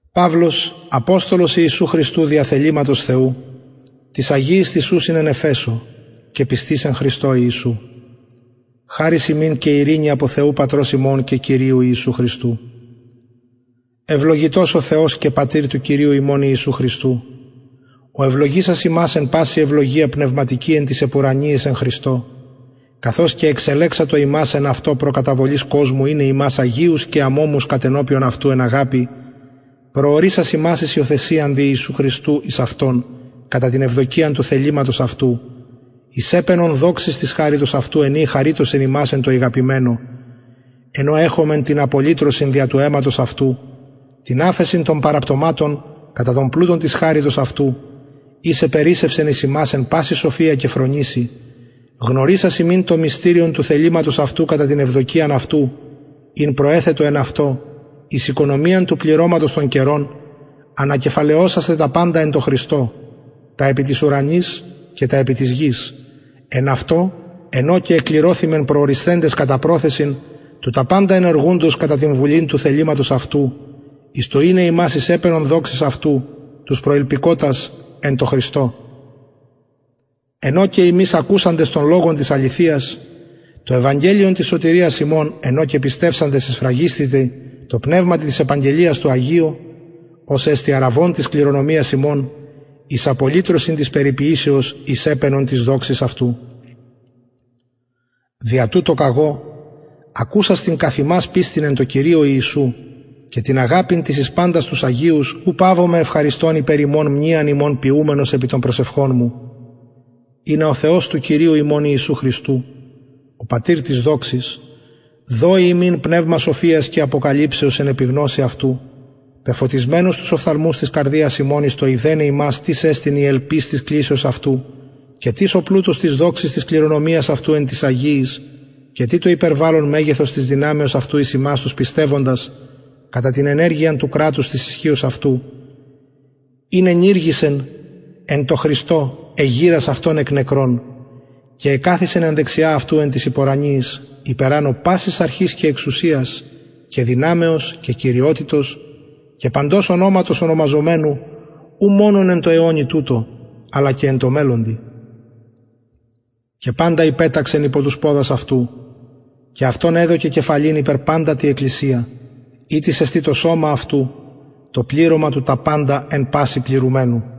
παυλος αποστολος ιησου χριστου δια θεληματος θεου τοις αγιοις τοις ουσιν εν εφεσω και πιστοις εν χριστω ιησου χαρις υμιν και ειρηνη απο θεου πατρος ημων και κυριου ιησου χριστου ευλογητος ο θεος και πατηρ του κυριου ημων ιησου χριστου ο ευλογησας ημας εν παση ευλογια πνευματικη εν τοις επουρανιοις εν χριστω καθως εξελεξατο ημας εν αυτω προ καταβολης κοσμου ειναι ημας αγιους και αμωμους κατενωπιον αυτου εν αγαπη προορισας ημας εις υιοθεσιαν δια ιησου χριστου εις αυτον κατα την ευδοκιαν του θεληματος αυτου εις επαινον δοξης της χαριτος αυτου εν η εχαριτωσεν ημας εν τω ηγαπημενω εν ω εχομεν την απολυτρωσιν δια του αιματος αυτου την αφεσιν των παραπτωματων κατα τον πλουτον της χαριτος αυτου ης επερισσευσεν εις ημας εν παση σοφια και φρονησει γνωρισας ημιν το μυστηριον του θεληματος αυτου κατα την ευδοκιαν αυτου ην προεθετο εν αυτω εις οικονομιαν του πληρωματος των καιρων ανακεφαλαιωσασθαι τα παντα εν τω χριστω τα επι τοις ουρανοις και τα επι της γης εν αυτω εν ω και εκληρωθημεν προορισθεντες κατα προθεσιν του τα παντα ενεργουντος κατα την βουλην του θεληματος αυτου εις το ειναι ημας εις επαινον δοξης αυτου τους προηλπικοτας εν τω χριστω εν ω και υμεις ακουσαντες τον λογον της αληθειας το ευαγγελιον της σωτηριας υμων εν ω και πιστευσαντες εσφραγισθητε τω πνευματι της επαγγελιας τω αγιω ος εστιν αρραβων της κληρονομιας ημων εις απολυτρωσιν της περιποιησεως εις επαινον της δοξης αυτου δια τουτο καγω ακουσας την καθ υμας πιστιν εν τω κυριω ιησου και την αγαπην την εις παντας τους αγιους ου παυομαι ευχαριστων υπερ υμων μνειαν υμων ποιουμενος επι των προσευχων μου ινα ο θεος του κυριου ημων ιησου χριστου ο πατηρ της δοξης δωη υμιν πνευμα σοφιας και αποκαλυψεως εν επιγνωσει αυτου πεφωτισμενους τους οφθαλμους της καρδιας υμων εις το ειδεναι υμας τις εστιν η ελπις της κλησεως αυτου και τις ο πλουτος της δοξης της κληρονομιας αυτου εν τοις αγιοις και τι το υπερβαλλον μεγεθος της δυναμεως αυτου εις ημας τους πιστευοντας κατα την ενεργειαν του κρατους της ισχυος αυτου ην ενηργησεν εν τω χριστω εγειρας αυτον εκ των νεκρων και εκαθισεν εν δεξια αυτου εν τοις επουρανιοις υπερανω πασης αρχης και εξουσιας και δυναμεως και κυριοτητος και παντος ονοματος ονομαζομενου ου μονον εν τω αιωνι τουτω αλλα και εν τω μελλοντι και παντα υπεταξεν υπο τους ποδας αυτου και αυτον εδωκεν κεφαλην υπερ παντα τη εκκλησια ητις εστιν το σωμα αυτου το πληρωμα του τα παντα εν πασιν πληρουμενου